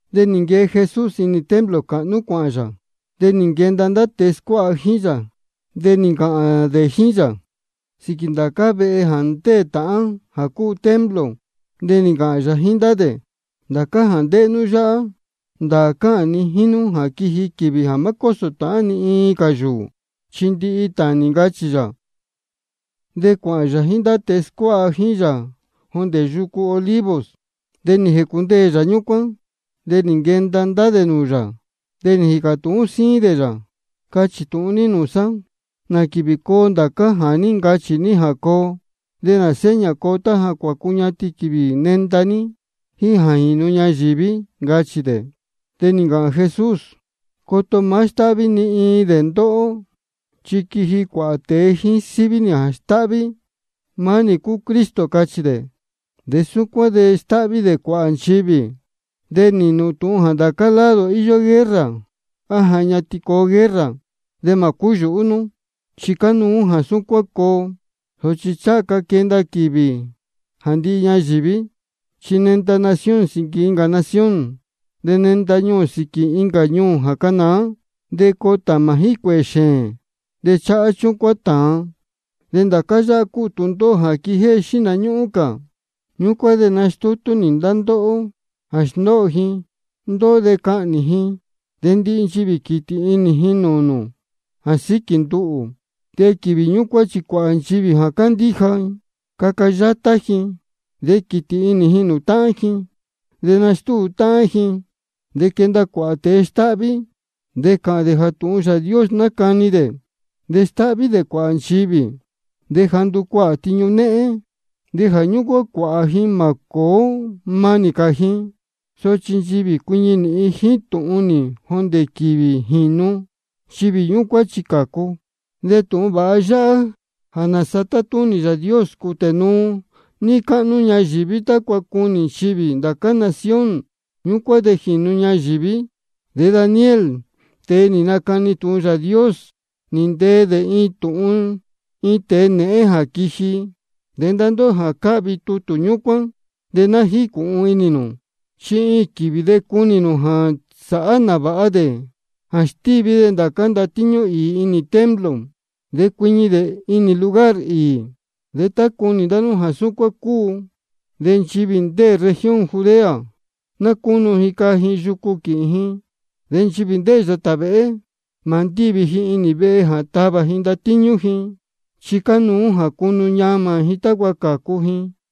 De nī nquee Jesús inī templo cāhnú cuāhān yā. De nī nquenda ndá tēe scuáha jíín yā, de nī ncāhān dē jíín yā sīquī ndācá vehe jā ndéē tāhán jā cúu templo. De nī ncāhān yā jíín ndá dē: Ndācá jā ndéhé nú yáhá, ndāā cáhān ni jíín nú jā quiji quīvī jā má cósō tāhán cā ni iin yūū, chi ndihi tānī, ncachī yā. De cuāhān yā jíín ndá tēe scuáha jíín yā jondē yucu Olivos, de nī jēcundeē yā ñúcuán. De nī nquenda ndá dē nūū yā, de nī jīcā tūhún síín dē yā: Cachī tūhun ní nūū sá, ¿nā quīvī coo ndācá jā ní ncachī ní jā coo? ¿De nā seña coo tá ja ncuñatin quīvī nenda ní jíín jā jīnu ñayīví? ncachī dē. De nī ncāhān Jesús: Coto má stáhví ni iin dē ndá ndóhó. Chi quiji cuāhā tēe jíín síví nī jā stáhví: Maá nī cúu Cristo, cachī dē. De súcuán de stáhví dē cuāhā nchivī. De nīhīn nū tūhun jā ndācá lado íyó guerra, á ja ñatin coo guerra. De mā cúyūhú nú, chi cánuú jā súcuán coo, sochi ncháha ca quenda quīvī jā ndihi ñayīví. Chi nenda nación sīquī incā nación, de nenda ñuū sīquī incā ñuū jā canāá. De coo tāmā jíín cuēhē xēēn. De cháhá chúcuán tāan. De ndācá yáhá cúu tūndóhó jā quijéhé xihna ñúhún cā. Ñúcuán de nastúu ji ndá ndóhó jā sndóho ji ndóhó de cahnī ji. De ndihi nchivī quītī inī ji nūū nū jā síquī nduhū. De quīvī ñúcuán chi cuāhā nchivī jā cándíja, caca yátá ji, de quītī inī ji nūū táhán ji, de nastúu táhán ji. De quenda cuāhā tēe stáhví, de cāhān dē jā tūhun Yāā Dios nácani dē, de stáhví dē cuāhā nchivī. De jā nducuahā tiñu néhén, de jā ñúcuán cuāhā ji mā cōó mānī cā ji. Sochi nchivī jā cuiñi nīhin jíín tūhun nī jondē quīvī jīnu, nchivī ñúcuán chi cācu. De tūhun vāha yáhá jā nāsa tátúnī Yāā Dios, cūtē nuu níí cáhnú ñayīví, tácua cunī nchivī ndācá nación. Ñúcuán de jīnu ñayīví. De Daniel, tēe nī nacani tūhun Yāā Dios, nī ntee dē tūhun iin tēe nēhén jā quiji. De ndá ndóhó jā cáhvi tutū ñúcuán, de ná jícūhun inī nū. Chi iin quīvī de cunī nū jā sāhá nāvāha dē jā stíví dē ndācá ndatíñú īī inī templo, de cuiñi dē inī lugar īī. De tá cunī ndá nú jā súcuán cúu, de nchivī ndéē región Judea, ná cúnu ji caa ji yucu quīhīn ji. De nchivī ndéē yātā vēhé, mā ndívi ji inī vehe jā tavā ji ndatíñú ji, chi cánuú jā cunu ñamā ji tácua cācu ji.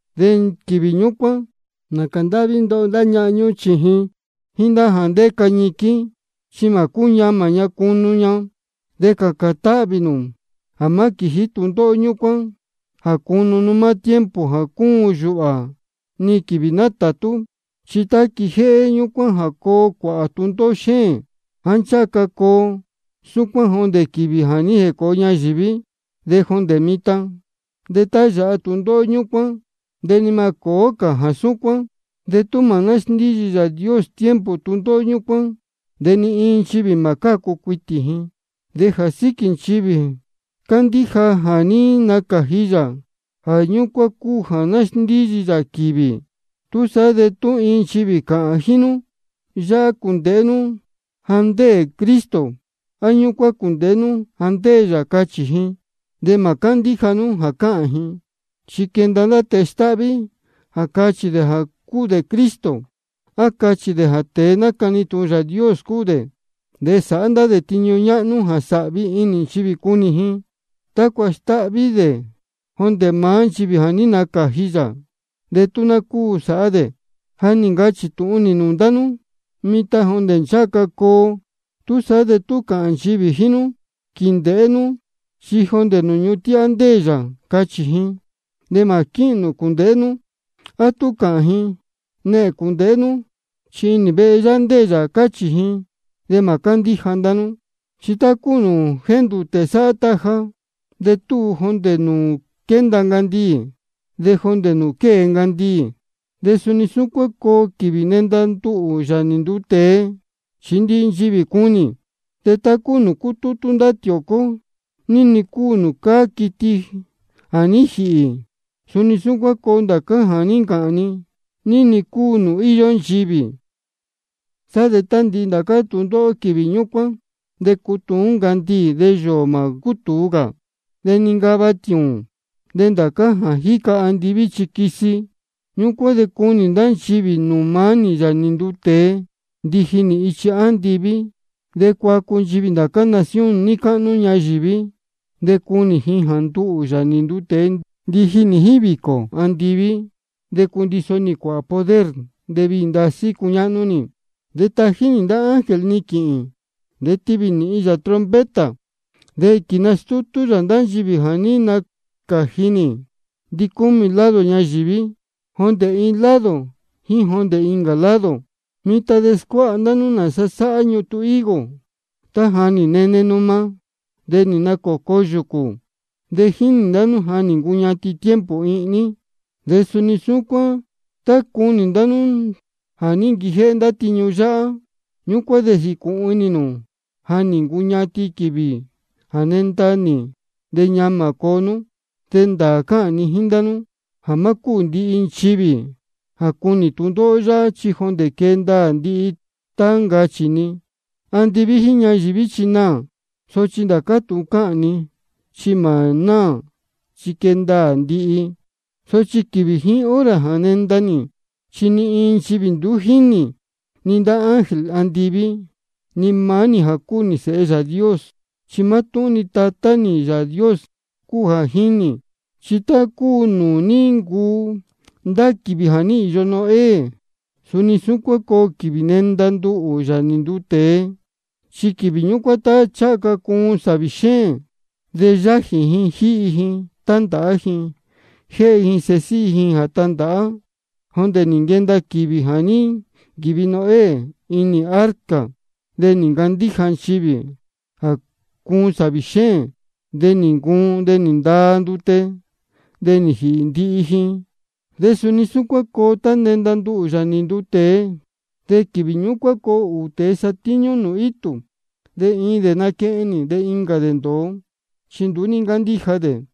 De quīvī ñúcuán, nācā ndáhví ndoho ndá ñahan ñúhún sēhe jíín jā ndéca ñiquín, chi mā cúñamā ña cunu ña. De cācān táhvī nū jā má quījí tūndóhó ñúcuán jā cunu nú maá tiempo jā cúun yūhā ni quīvī nátātú. Chi tá quijéhé ñúcuán de coo cuāhā tūndóhó xéēn, jāá ncháha ca coo súcuán jondē quīvī jā ní jēcōo ñayīví de jondē mitan. De tá yāha tūndóhó ñúcuán de ni mā cōó cā jā súcuán. De tú mā násndíyi Yāā Dios tiempo tūndóhó ñúcuán, de ni iin nchivī mā cácu cuitī ji. De jā síquī nchivī cándíja jā ní nacāji yā, jā ñúcuán cúu jā nasndíyi yā quīvī. Túsaá de tú iin nchivī cāhān jíín nú: Yáhá cūndēhé nú jā ndéē Cristo, á: Ñúcuán cūndēhé nú jā ndéē yā, cachī ji, de mā cándíja nú jā cáhān ji. Chi quenda ndá tēe stáhví jā cachī dē jā cúu dē Cristo, á cachī dē jā tēe nácani tūhun Yāā Dios cúu dē. De sāhá ndá dē tiñu ñáhnú jā sāhvi inī nchivī cunī ji, tácua stáhví dē jondē maá nchivī jā ní nacāji yā, de tú ná cúu sāhá dē. Ja nī ncachī tūhun nī nūū ndá nú mitan jondē ncháha ca coo. Túsaá de tú cāhān nchivī jíín nú: Quīndēhé nú, chi jondē nūū ñuhun tíhá ndéē yā, cachī ji, de mā quíhīn nū cūndēhé nú. A tú cāhān ji: Nehēn cūndēhé nú, chi inī vehe yáhá ndéē yā, cachī ji, de mā cándíja ndá nú. Chi tá cúu nūū jéndūtē sáhá taja, de túu jondē nūū quénda ncandiī de jondē nūū quée ncandiī, de suni súcuán coo quīvī nenda nduhū, Yāā nī nduu tēe, chi ndihi nchivī cunī. De tá cúu nūū cútútú ndá tiōcó ní-ni cúu nūū cáá quiti jā ní jīhī, suni súcuán coo ndācá jā ní ncāhān ni, ní-ni cúu nūū íyó nchivī. Sá de tá nī ndihi ndācá tūndóhó quīvī ñúcuán, de cutuún ncandiī, de yōō mā cútūu cā. De nincava tiūūn, de ndācá jā jíca andiví chi quisi. Ñúcuán de cunī ndá nchivī nūū maá nī, Yāā nī nduu tēe, ndiji nī ichi andiví. De cuacu nchivī ndācá nación níí cáhnú ñayīví. De cunī ji jā nduhū, Yāā nī nduu tēe, ndiji nī jíín vīcō andiví, de cundiso nī cuāhā poder, de viī ndasí cuñáhnú nī. De tají nī ndá ángel ni quīhīn, de tivī nīhin yā trompeta. De quīnastútú yā ndá nchivī jā ní nacāji nī ndicúmī lado ñayīví, jondē iin lado jíín jondē incā lado. Mitan de scuáha ndá nú nāsa sáhá ñutun higo: Tá ja nī nene numa, de nī nacōco yūcū, de jínī ndá nú ja nī ncuñatin tiempo ihní. De suni súcuán tá cunī ndá nú jā ní nquijéhé ndá tiñu yáhá, ñúcuán de jīcūhun inī nū ja nī ncuñatin quīvī jā nenda nī, de ñamā coo. De ndāā cáhān ni jíín ndá nú jā má cúū ndihi nchivī jā cunī tūndóhó yáhá, chi jondē quee ndaā ndihi tá ncachī ni. Andiví jíín ñayīví chi naā, sochi ndācá tūhun cáhān ni chi mā náā, chi quee ndaā ndihi. Sochi quīvī jíín hora jā nenda nī, chi ni iin nchivī nduú jínī, ni ndá ángel andiví, ni maá nī jā cúu Sēhe Yāā Dios. Chi mátúhún-ni Tatá nī Yāā Dios cúu jā jínī. Chi tá cúu nūū ní ncuu ndá quīvī jā ní īyo Noé, suni súcuán coo quīvī nenda nduhū, Yāā nī nduu tēe. Chi quīvī ñúcuán tá ncháha ca cuun sāvī xéēn, de yájī ji jíhi ji, tándāhá ji, de jéhe ji sēhe síhí ji jā tandāhá, jondē nī nquenda quīvī jā ní nquīvi Noé inī arca. De nduú ní ncándíja nchivī jā cuun sāvī xéēn, de nī ncuun, de nī ndaa ndute, de nī jīhī ndihi ji. De suni súcuán coo tá nenda nduhū, Yāā nī nduu tēe. De quīvī ñúcuán coo ūū tēe satíñú nūū itū. De iin dē naquehen nī, de incā dē ndōo, chi nduú ní ncándíja dē.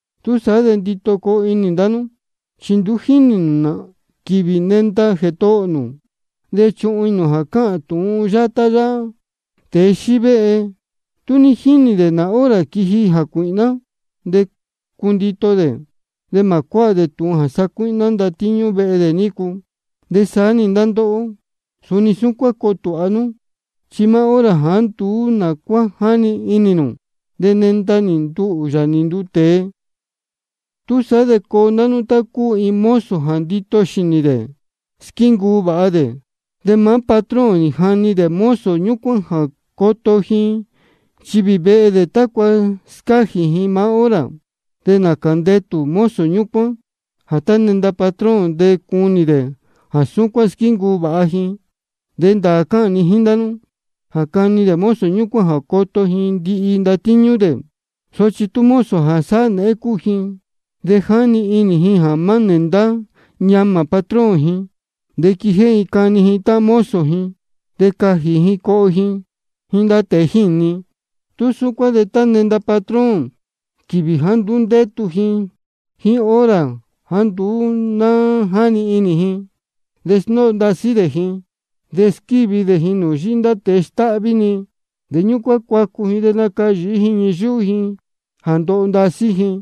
Túsaá de ndito coo inī ndá nú, chi nduú jínī nū nā quīvī nenda Jētohō nū. De chuhun inī nū jā cáhān tūhun yátá yáhá: Tēe xívéhe, tú ní jínī dē nā hora quiji jācuīhná, de cundito dē, de mā cuáha dē tūhun jā sacuíhná ndatíñú vehe dē nícu. De saá-ni ndá ndóhó, suni súcuán coo tūha nú, chi maá hora jāá nduú nā cuá jáni inī nū, de nenda-ni nduhū, Yāā nī nduu tēe. Túsaá de coo ndá nú tá cúu iin mozo jā ndito xīnī de squíncuu vāha. De maá patrón nī jani dē mozo ñúcuán jā coto ji nchivī vehe dē, tácua scájī ji maá hora. De nācā ndetū mozo ñúcuán jā tá nenda patrón, de cunī dē jā súcuán squíncuu vāha ji. De ndāā cáhān ni jíín ndá nú jā cani dē mozo ñúcuán jā coto ji ndihi ndatíñú dē. Sochi tú mozo jā sáhá nēhén cúu ji, de jáni inī ji jā má nēndá ñamā patrón ji, de quijéhé ji cani ji táhán mozo ji, de cajī ji coho ji jíín ndá tēe jíni, tú súcuán de nenda-ni patrón quīvī jāá nduú ndétu ji jíín hora jāá nduú ná jáni inī ji. De sndóho ndasí dē ji, de squívi dē ji nūū yíhí ndá tēe stáhví-ni. De ñúcuán cuacu ji de nacayīhí ji ñii yúhú ji jā ndoho ndasí ji.